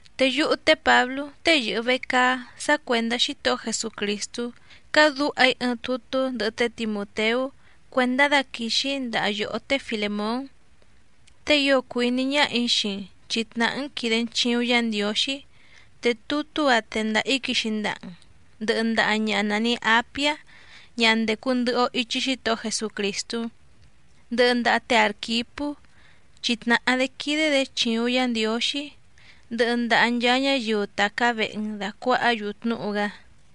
Te yúhú té Pǎblú tée yɨ̀hɨ vecaá sá cuèndá Xítohó Jesucrìstú cádǔha‑í ɨɨⁿ tutú ndɨhɨ té Timùteú cuèndá daquìxi‑í ndaha yòhó té Filèmón, te ío cùu iní ñáhà‑í xii‑n chi tnàhá‑n quìde‑n chiuⁿ Yá Ndiǒxí. Te tutú‑a tèndaha‑í quixi ndaha‑n ndɨhɨ ndaha ñaha nàni Apiá ñaha ndècu ndɨhɨ‑o ichi Xítohó Jesucrìstú, ndɨhɨ ndaha té Àrquipú, chi tnàhá‑dé quídé‑dě chìuⁿ Yá Ndiǒxí, ndɨhɨ ndaha nchaa ñáyiu tàcá vehe‑n dàcuahá‑yu tnúhu‑gá.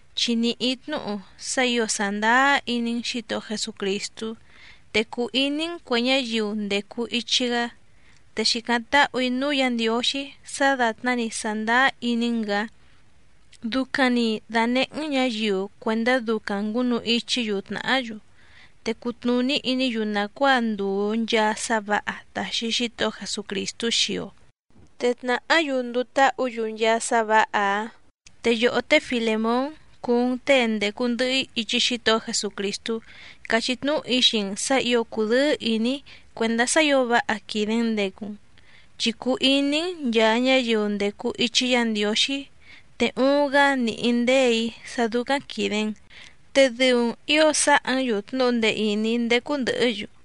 Chi nìhí‑í tnúhu sá ǐo sàndáá iní‑n Xǐtohó Jesucrìstú, te cùu iní‑n cuè ñáyiu ndècu ichi‑gá. Te xìcáⁿ táhù‑í núú Yǎ Ndiǒxí sá dàtná‑ni sàndáá iní‑n‑gǎ ducaⁿ‑ni dànehé‑n ñǎyiu cuèndá ducaⁿ ngǔnu ichí‑yu tnàhá‑yu, te cutnùní iní‑yu nàcuáa ndùu nchaa sá vǎha tàxi Xítohó Jesucrìstú xii‑o, te tnàhá‑yu nduu táhǔ‑yu nchaa sá vǎha‑áⁿ. Te yòhó té Filèmón cúú‑n těe ndècu ndɨhɨ‑í ichi Xítohó Jesucrìstú càchí tnúhu‑í xii‑n sǎ ǐo cùdɨ́ɨ́ ìní‑í cuèndá sá ǐo váha quìde‑n ndecu‑n, chi cùu iní‑n nchàa ñáyiu ndècu ichi Yá Ndiǒxí, te uuⁿ‑gá nìhí ndéè‑í sá dúcáⁿ quìde‑n, te dɨu‑n ǐo sáhǎ‑n‑yu tnúhu ndee ìní ndécú ndɨ̀hɨ́‑yu.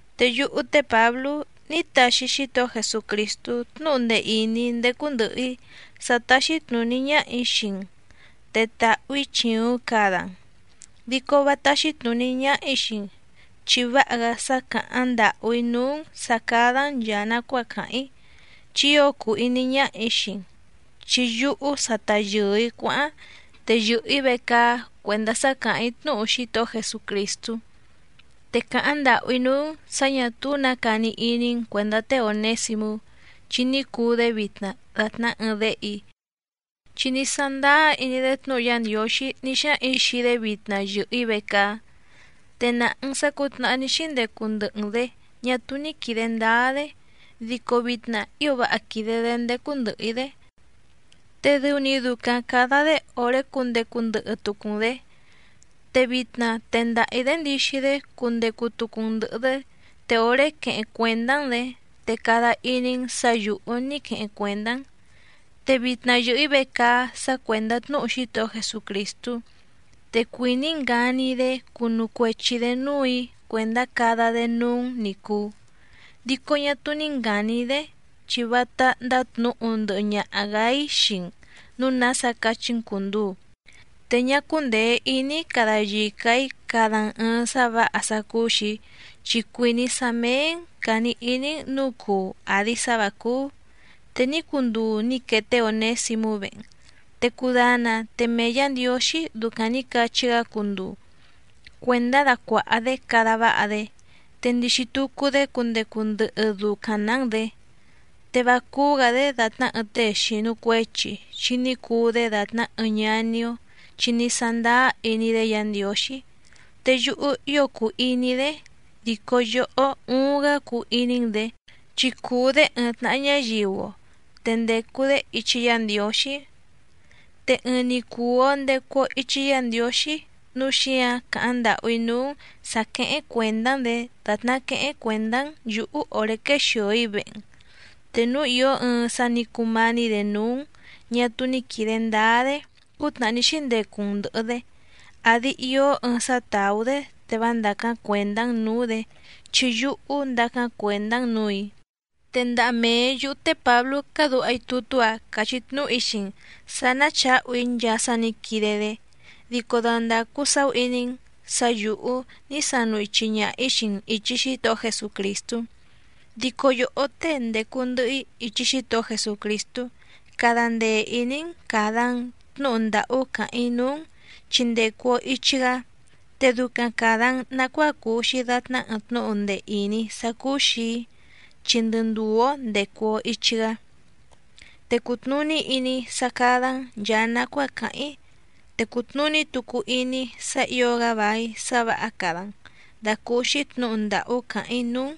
Te yúhú té Pǎblú ní taxi Xítohó Jesucrìstú tnúhu ndee ìní ndécú ndɨ̀hɨ‑í sá táxí tnùní ñáhà‑í xii‑n te tahu‑ǐ chìuⁿ cada‑n, dico vá táxí tnùní ñáhà‑í xii‑n, chi váha‑gá sá càháⁿ ndàhú‑í núú‑n sǎ cádá‑n nchàa nacuáa càháⁿ‑í chi ío cùu iní ñáhà‑í xii‑n. Chi yúhú sa ta yɨ̀ɨ‑í cuáháⁿ, te yɨ̀hɨ‑í vecaá cuèndá sá càháⁿ‑í tnúhu Xítohó Jesucrìstú. Te càháⁿ ndàhú‑í núú‑n sǎ ñà túú nǎ cani iní‑n cuèndá té Ònésimú, chi ní cuu‑dé vitna dàtná ɨɨⁿ déhe‑í, chi ní sándáá iní‑dé tnúhu Yá Ndiǒxí ní xáhaⁿ‑ǐ xii‑dé vitna yɨ̀hɨ‑í vecaá. Te nàha‑n sá cǔtnàhá ní xíndecu ndɨhɨ‑n‑dě ñá túú ní quìde ndáá‑dé, dico vitna ío váha quìde‑dé ndécú ndɨ̀hɨ‑í‑dé, te dɨu‑ni ducaⁿ càda‑dé òré cundecu ndɨhɨ tucu‑n‑dě. Te vitna tendaha‑ǐ‑dé ndixi‑dé cundecu tucu‑n ndɨ̀hɨ‑dé, te òré queheⁿ cuèndá‑n‑dě, te cada iní‑n sǎ yǔhú ní queheⁿ cuèndá‑n. Te vitna yɨ̀hɨ‑í vecaá sá cuèndá tnúhu Xítohó Jesucrìstú, te cuìní‑í ngani‑í‑dé cunu cuechi‑dě núù‑í cuèndá cada‑dé núú‑n ní cùu. Dico ñá túú ní ngàni‑í‑dé, chi vátá ndátnǔhu ndɨhɨ ñaha‑gǎ‑í xii‑n nǔu nása cachí‑n cùnduu. Te ñá cúndèe iní‑í cada yica‑ǐ cada‑n ɨ̀ɨⁿ sá vǎha sá cúú‑xì‑í, chi cuìní‑í sá méé‑n càni iní‑n nǔu cuu àdi sá vǎ cúú. Te ní cunduu nǐ quee té Ònésimú vehe‑n, te cudana te mee Yǎ Ndiǒxí ducaⁿ nǐ cachí‑gá cunduu cuèndá dacuàha‑dé cada váha‑dé. Te ndixi tucu‑dé cundecu ndɨhɨ ducaⁿ‑nǎ‑n‑dě. Te vá cúú‑gǎ‑dé dàtná ɨɨⁿ tée xìnu cuechi chi ní cuu‑dé dàtná ɨɨⁿ ñaní‑ó chi ní sándáá iní‑dé Yǎ Ndiǒxí, te yúhú ío cùu iní‑í‑dé, dico yòhó uuⁿ‑gá cuu iní‑n‑dě, chi cùu‑dé ɨɨⁿ tnàha ñáyiu‑o, te ndècu‑dé ichi Yá Ndiǒxí. Te ɨɨⁿ‑ni cùu‑o ndecu‑o ichi Yá Ndiǒxí nǔu xíǎⁿ càháⁿ ndàhú‑í núú‑n sǎ quéhéⁿ cuèndá‑n‑dě dàtná quéhéⁿ cuèndá‑n yǔhú òré quéxìo‑í vehe‑n. Te núu ìó ɨɨⁿ sá nǐ cumání‑dě núú‑n ñà túú ní quìde ndáá‑dé cútnàhá ní xíndecu‑n ndɨ̀hɨ‑dé, àdi ió ɨɨⁿ sá tàú‑dé te vá ndàcáⁿ cuèndá‑n nǔú‑dě, chi yúhú ndacáⁿ cuèndá‑n nǔù‑í. Te ndaha mee yǔhú té Pǎblú cádǔha‑í tutú‑a càchí tnúhu‑í xii‑n sǎ ná chǎhu‑í nchaa sá nǐ quide‑dé. Dico dandàcu saú iní‑n sǎ yǔhú ní sanu ichi ñaha‑ǐ xii‑n ìchi Xítohó Jesucrìstú. Dico yòhó tée ndècu ndɨhɨ‑í ichi Xítohó Jesucrìstú cada ndee ìní‑n càda‑n tnúhu ndàhú càháⁿ‑í núú‑n chi ndècu‑o ichi‑gá. Te ducaⁿ càda‑n nacuáa cuu‑xi dàtná ɨɨⁿ tnúhu ndee ìní sá cúú‑xì‑í, chi ndɨ ndùú‑ó ndècu‑o ichi‑gá. Te cùtnuní iní‑í sá cádá‑n nchàa nacuáa càháⁿ‑í, te cùtnuní tucu iní‑í sá ǐo‑gá vài sá vǎha cada‑n dàcúúxí tnǔhu ndàhú càháⁿ‑í núú‑n,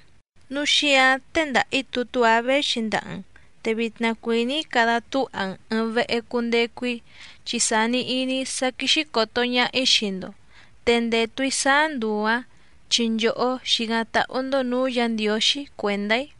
núu xíǎⁿ tèndaha‑í tutú‑a véxi ndaha‑n. Te vitna cuìní‑í cada túha‑n ɨ̀ɨⁿ vehe cundecu‑í, chi sàni iní‑í sá quíxí còto ñaha‑í xii‑ndo, te ndètu‑í sáá nduu‑ǎⁿ chi nchòhó xìcáⁿ táhú‑ndó nǔú Yǎ Ndiǒxí cuèndá‑í.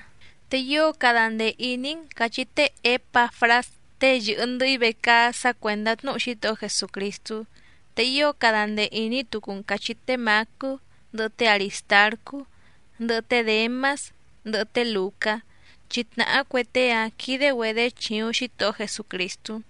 Te ío cada ndee ìní‑n càchí té Ěpafrás tée yɨ̀hɨ ndɨhɨ‑í vecaá sá cuèndá tnúhu Xítohó Jesucrìstú. Te ío cada ndee ìní tucu‑n càchí té Mǎcú, ndɨhɨ té Arìstarcú, ndɨhɨ té Děmás, ndɨhɨ té Lùcá, chi tnàhá cue tée‑ǎⁿ quìde‑güedé chìuⁿ Xítohó Jesucrìstú.